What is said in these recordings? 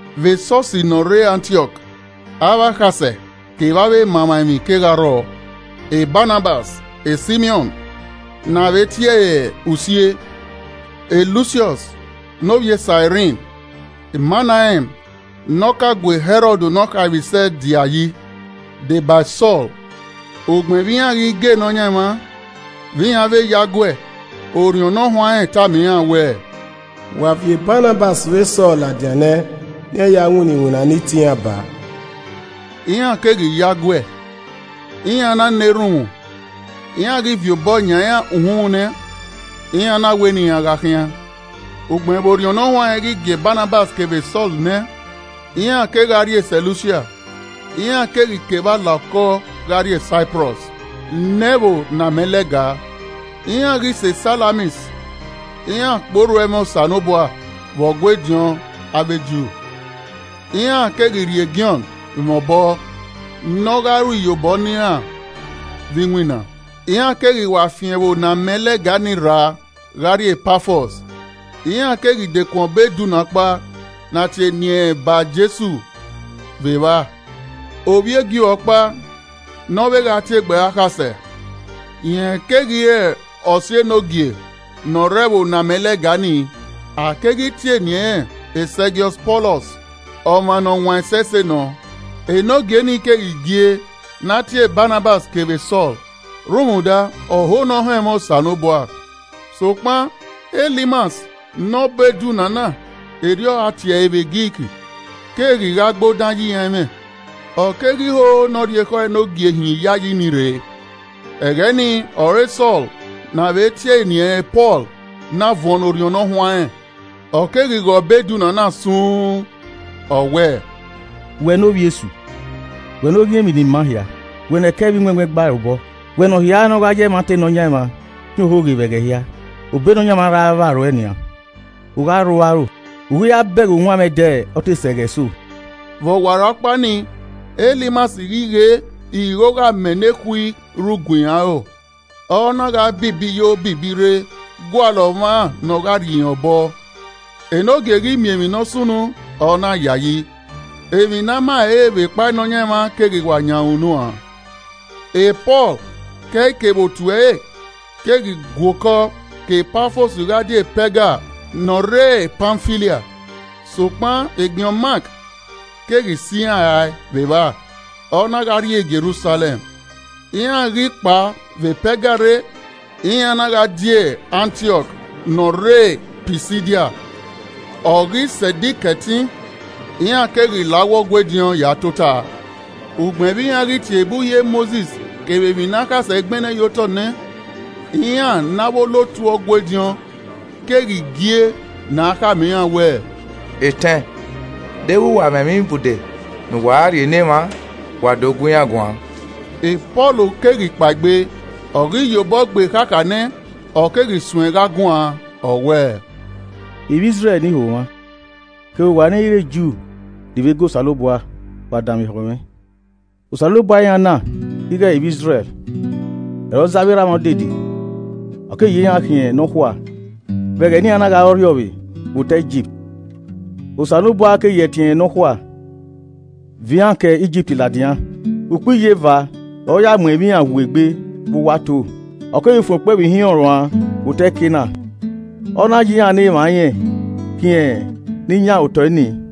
Vbe Esọsi ne ọ rre Antiọk, avbe akhasẹ kevbe avbe emamwaemwi kegha rrọọ: Banabas, Simiọn (ne a vbe tie ẹre Usie,) Lusiọs (ne ovbi e Sairin,) Manaen (ne ọ ka gu Hẹrọd ne ọ khaemwisẹ dia yi,) de ba e Sọl. Ugbẹn vbe iran ghi ga Nọyaẹnmwa, vbe iran vbe yo aguẹ, Orhiọn Ne Ọ Huanrẹn tama iran wẹẹ, “Wa viọ Banabas vbe Sọl ladian nẹ ne iran ya winna iwinna ne I tie iran baa.” Iran keghi yo aguẹ, iran na na erhunmwu, iran ghi viọ obọ yan iran uhunmwu nẹ, iran na wẹ ne iran gha khian. Ugbẹn vbe Orhiọn Ne Ọ Huanrẹn ghi gie Banabas kevbe Sọl nẹ, iran kegha rrie Sẹlusia, iran keghi ke evba la okọ gha rrie Saiprọs ne ẹvbo ne amẹ lẹga. Iran ghi sẹ Salamis, iran kpe orhu ẹmwẹ Osanobua vbe Ọgua ediọn avbe Ju, iran keghi rhie Jọn mwẹ obọ ne ọ gha ru iyobọ ne iran vbe iwinna. Iran keghi wa fian ẹvbo ne amẹ lẹga ni rra gha rrie Pafọs, iran keghi dekun ọbo edunna ọkpa ne a tie eni ẹnrẹn Ba-Jesu vbe evba, ovbi e Ju ọkpa ne ọ vbe gha tie egbe ẹre akhasẹ. Rẹn keghi re ọse Enogie ne ọ rre ẹvbo ne amẹ lẹga ni, a keghi tie eni ẹnrẹn Segiọs Pọlọs, ọmwa ne ọ wan ẹsẹse nọ. Enogie nii keghi gie ne a tie Banabas kevbe Sọl rhunmwuda, ọho ne ọ họn ẹmwẹ Osanobua. Sokpan, Elimas ne ọbo edunna na (erriọ a tie ẹre vbe Grik) keghi gha gbe odan ye iran ẹmwẹ, ọ keghi ho ne ọ rhie ekhọe Enogie hin iyayi ni rre. Ẹghẹ nii ọre Sọl, ne avbe tie eni ẹnrẹn Pọl, na vuọn ne Orhiọn Ne Ọ Huanrẹn, ọ keghi ghe ọbo edunna na sun uun, ọ wẹẹ, “Wẹ ne ovbi e Esu. Wẹ ne oghian emwi ni maa hia, wẹ ne ẹkẹ vbe iwẹnwẹn gba ẹre obọ, wẹ ne ọ hia ne ọ gha ya ẹmwata Nọyaẹnmwa khian ohoghe vbe ẹghẹ hia! Obọ Nọyaẹnmwa ra vba ruẹ nian, u gha rhu aro, u i ghi ra bẹghe uwanmwẹ ẹdẹ ọ te sẹ ẹghẹ eso.” Vbe ọwarọkpa nii, Elimas ghi ghe ighogho amẹ nekhui rhu gue irẹn aro, ọ na gha bibi yo bibi rre gualọ ọmwa ne ọ gha rhie irẹn obọ. Enogie ghi miẹn emwi ne ọ sunu, ọ na yayi, emwi ne a ma ẹre re vbe kpa Nọyaẹnmwa keghi wa yan ẹre unu uan. Pọl ke ẹe kevbe otu ẹre keghi gua okọ ke Pafọs gha die Pẹga ne ọ rre Pamfilia, sokpan Jọn Mak keghi sẹ iran rae vbe evba, ọ na gha rrie Jerusalẹm. Iran ghi kpao vbe Pẹga rre, iran na gha die Antiọk ne ọ rre Pisidia, ọ ghi sẹ Ẹdẹ Ikẹtin, iran keghi la uwu Ọgua ediọn ya tota. Ugbẹn vbe iran ghi tie ebe Uhi Mosis kevbe emwi ne akhasẹ gbẹnnẹ ye otọ nẹ, iran ne avbe olotu Ọgua ediọn keghi gie ne a khama iran wẹẹ, “Etẹn, deghẹ wa mwẹ ẹmwẹ ibude ne uwa gha rhie ne emwa, wa do gu iran guan.” Pọl keghi kpaegbe, ọ ghi ya obọ gbe ekhakha nẹ, ọ keghi suẹn gha guan, ọ wẹẹ, “Ivbi Izrẹl ne iho mwa, kevbe uwa ne ẹ i re Ju ni vbe ga Osanobua, wa danmwehọ mwẹ! Osanobua iran na ighẹ ivbi Izrẹl, ọre ọ zẹ avbe erha mwa odede, ọ keghi ya iran khian nọkhua vbe ẹghẹ ne iran na gha re ọrriọvbe vbe otọe Igipt, Osanobua keghi ya ẹtin ẹnrẹn nọkhua viọ iran ke Igipt ladian. Ukpo iyeva ọre ọ ya mu ẹmwẹ iran woo egbe vbe uwu ato. Ọ keghi fuẹn okpẹvbo ihinrọn ruan vbe otọ Kenan, ọ na ya iran ne emwa irẹn khian ni yan otọ nii.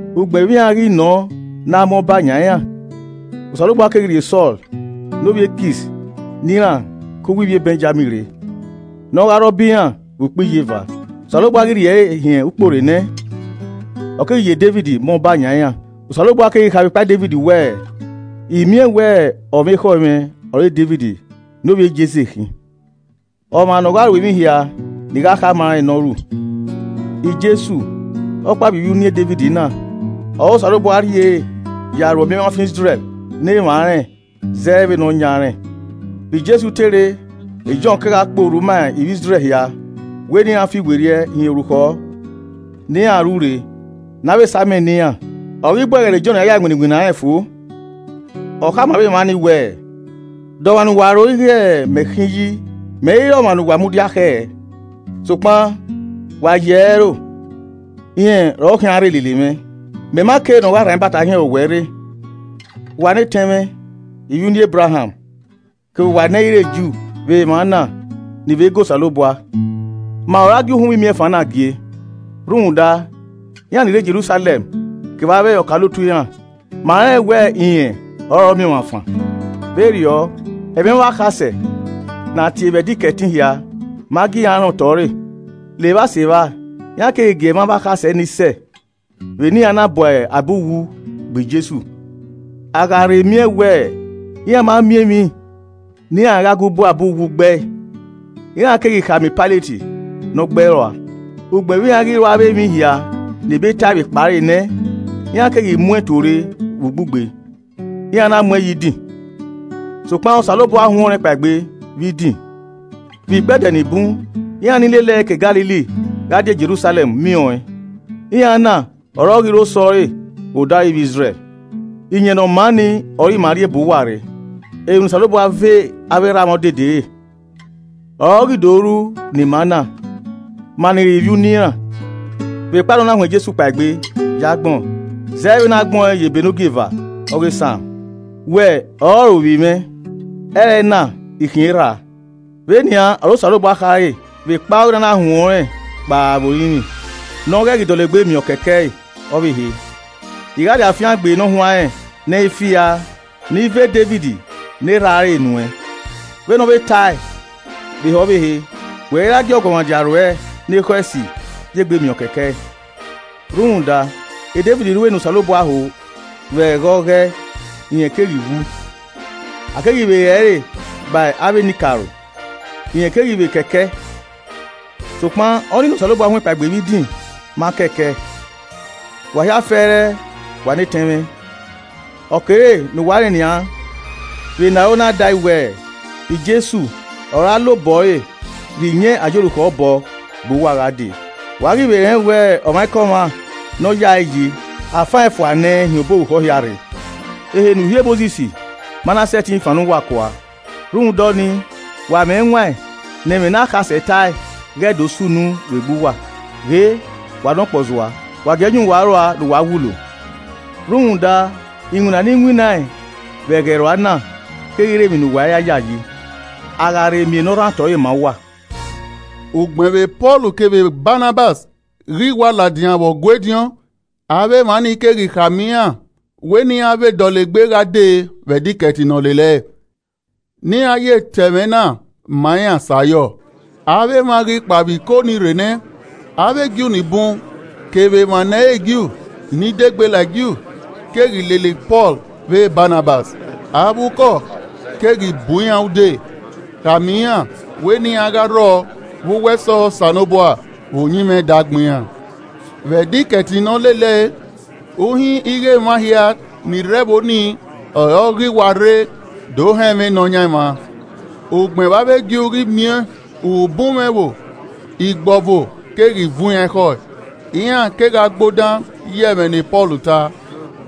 Ugbẹn vbe iran ghi nọ ne a ma ọba yan iran, Osanobua keghi rhie Sọl ne ovbi e Kis ne iran ke uwu ivbi Bẹnjamin rre, ne ọ gha re ọba ima vbe ukpo iyeva. Osanobua ghi rhie ẹre hin ukpo re nẹ, ọ keghi ye Devid ma ọba yan iran, Osanobua keghi kha vbe ekpa Devid wẹẹ, ‘I miẹn wẹ ọmwa ekhọe mwẹ ọre Devid ne ovbi e Jese khin, ọmwa ne ọ gha ru emwi hia ne I gha khama ẹn ne ọ ru.’ Jesu, ọkpa vbe ivbi e uniẹn Devid na, ọre Osanobua rhie ya ru Ọmiọnmwafan Izrẹl ne emwa rẹn zẹ vbe ne ọ yan rẹn. Vbe Jesu te rre, Jọn kegha kpe orhu ma ivbi Izrẹl hia wẹ ne iran fiwerriẹ hin orukhọ ne iran ru rre, ne a vbe sa amẹ ne iran. Ọ ghi bu ẹghẹ ne Jọn ra ya winna iwinna rẹn fo, ọ khama avbe emwa nii wẹẹ, ‘De ọmwa ne uwa ro ighẹ mẹ khin yi? Mẹ i re ọmwa ne uwa mudia khẹ, sokpan wa yi ẹre ẹro, rẹn ọre ọ khian rre lele mwẹ. Mẹ ma ke ne ọ gha rhan ibata hin ẹre owẹ rre.’ “Wa ne etẹn mwẹ, ivbi uniẹn Ebraham, kevbe uwa ne ẹ i re Ju, vbe emwa na, ni vbe ga Osanobua, ma ọre a gie uhunmwu imiẹnfan na gie. Rhunmwuda, iran ni rre Jerusalẹm kevbe avbe ọkaolotu iran, ma rẹn wẹ rẹn ọrọre ọmiọnmwafan, vberriọ, ẹmwẹ avbe akhasẹ ne a tie vbe Ẹdẹ Ikẹtin hia ma gie iran rẹn otọ ẹre. Levba Sevba, iran keghi gie ẹmwẹ avbe akhasẹ nii sẹ vbe ne iran na bu abe uwu gbe Jesu. A gha rhe miẹn wẹ iran ma miẹn emwi ne iran gha gu bu abe uwu gbe ẹe, iran keghi khama Pailet ne ọ gbe ẹe rua. Ugbẹn vbe iran ghi ru avbe emwi hia ne Ebe tae vbe ekpa ẹre nẹ, iran keghi mu ẹn tuorre vbe ugbugbe, iran na mu ẹn ye idin. Sokpan Osanobua huẹn ọnrẹn kpaegbe vbe idin. Vbe ikpẹdẹ ni bun, iran ni lele ẹe ke Galili gha die Jerusalẹm miẹn ọẹn. Iran na ọre ọ ghi re osẹe ọre vbe odaro ivbi Izrẹl. Iyẹn Ne ọ maa nii ọre ima rhie bu uwa rre, emwi ne Osanobua ve avbe erha mwa odede e, ọre ọ ghi do ru ne ima na, ma ni re ivbi uniẹn iran, vbekpa ne ọ na huẹn Jesu kpaegbe ye agbọn. Zẹ vbe ne a gbẹn ọẹn ye ebe ne ogieva ọghe Psalm: “ ‘Wẹ ọrọre ovbi mwẹ. Ẹrẹna I khian Erha a.’ “Vbe nian ọre Osanobua khare vbekpa ọghe ne a na huẹn ọnrẹn kpao vbe orinmwi, ne ọ ghẹ ghi dọlegbe miẹn ọkẹkẹe ọvbehe: “ ‘I gha rhie afiangbe ne ọ huanrẹn ne ẹ i firaa ne I ve Devid ne erhaa re nuẹn.’ “Vbene ọ vbe tae vbe ehe ọvbehe, “ ‘Wẹ i ra gie ọguọmwadia ruẹ ne ekhọe esi ya egbe miẹn ọ kekẹe.’ “Rhunmwuda, Devid ru ne Osanobua ho vbe ẹghẹ ọghọe, rẹn keghi wu, a keghi vbe re ẹre ba avbe enikaro, rẹn keghi vbe kẹkẹ. Sokpan ọnii ne Osanobua huẹn kpaegbe vbe idin ma kẹkẹ. Wa hia fẹrẹ, wa ne etẹn mwẹ, Ọ kere ne uwa rẹn nian vbe ne aro na da ẹe wẹ, Jesu ọre a la obọ ẹre rhie iyẹn a ya orukhọ bọ, bu uwa gha dee. Wa ghi vbe rẹn wẹ ọmwaikọmwa ne ọ yae yi, a fan ẹn fua nẹ hin obọ orukhọ hia rre, ehe ne Uhi e Mosis ma na sẹtin fannọ uwa kua. Rhunmwuda ọnii, wa mwẹ ẹwaẹn ne ẹmwẹ ne akhasẹ tae ghẹ do sunu vbe egbe uwa: “ ‘Ghe, wa ne ọkpọzua, wa gie ẹe yan uwa aro ua ne uwa wulo! Rhunmwuda iwinna ne I winna vbe ẹghẹ rua na keghi re emwi ne uwa i ra yayi, a gha rhe miẹn ne ọ rhan otọ ẹre ma uwa!’” Ugbẹn vbe Pọl kevbe Banabas ghi wa ladian vbe Ọgua ediọn avbe emwa ni keghi khama iran wẹ ne iran vbe dọlegbe gha dee vbe Ẹdẹ Ikẹtin ne ọ lele ẹe, ne iran ye ta ẹmwẹ na ma iran sẹ ayọ. Avbe emwa ghi kpao vbe iko nii rre nẹ, avbe Ju ni bun kevbe emwa ne ẹ i re Ju ni dẹ egbe la e Ju, keghi lele Pọl vbe Banabas. Avbe ukọ keghi bu iran ude, khama irn wẹ ne iran gha rrọọ vbe uwu ẹsọhẹ Osanobua vbe uyinmwẹ ẹdẹ agbọn iran. Vbe Ẹdẹ Ikẹtin ne ọ lele ẹe, uhin ighẹ emwa hia ni rre ẹvbo ni ọre ọ ghi wa rre do họn ẹmwẹ Nọyaẹnmwa. Ugbẹn vbe avbe Ju ghi miẹn ubunmwẹ ẹvbo, igbọvo keghi vuọn iran ekhọe, iran kegha gbe odan ye ẹmwẹ ne Pọl ta,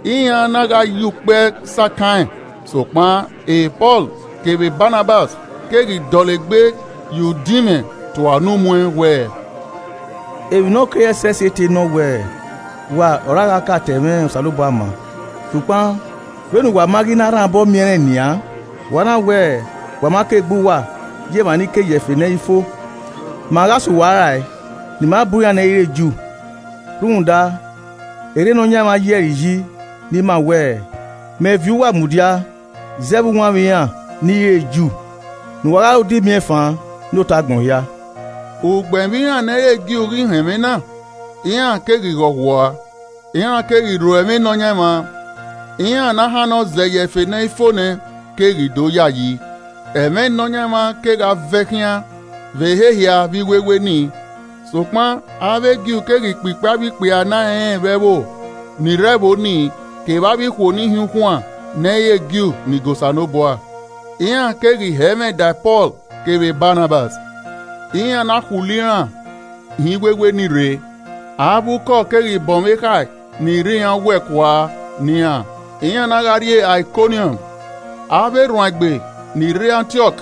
iran na gha ya ukpẹ sakan ẹn. Sokpan Pọl kevbe Banabas keghi dọlegbe ya udinmwẹ tua unu muẹn wẹẹ, “Emwi ne ọ kere ẹsẹse te nọ wẹ, wa ọre a gha ka ta ẹmwẹ Osanobua ma, sokpan vbe ne uwa ma ghi na rhan obọ miẹn rẹn nian, wa na wẹ, wa ma ka egbe uwa ye emwa ni ke ye ẹfe ne ẹ i fo, ma gha sẹ uwa rae ne ima bu iran ne ẹ i re Ju. Rhunmwuda erriọ Nọyaẹnmwa yi ẹre iyi ne ima wẹẹ, “ ‘Mẹ viọ uwa mudia zẹ vbe uwanmwẹ iran ni i re Ju, ne uwa gha re odẹ imiẹnfan ne otọ agbọn hia.’” Ugbẹn vbe iran ne ẹ i re Ju ghi họn ẹmwẹ na, iran keghi ghọghua, iran keghi rho ẹmwẹ Nọyaẹnmwa, iran ne a hannọ zẹ ye ẹfe ne ẹ i fo nẹ, keghi do yayi. Ẹmwẹ Nọyaẹnmwa, kegha vẹ. khian vbe ehe hia vbe iwewe nii. Sokpan avbe Ju keghi kpikpi avbe ikpia ne a rẹn vbe ẹvbo, ni rre ẹvbo nii, kevbe avbe ikhuo ni hin ukhuaẹn ne ẹ i re Ju, ni ga Osanobua. Iran keghi hẹ ẹmwẹ da Pọl kevbe Banabas, iran na khulo iran hin iwewe ni rre. Avbe ukọ keghi bọnmwẹ ekhae ni rre iran owẹ kua ne iran, iran na gha rrie Aikọniọm. Avbe erhuanegbe ni rre Antiọk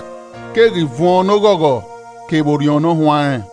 keghi vuọn ne oghọghọ kevbe Orhiọn Ne ọ Huanrẹn.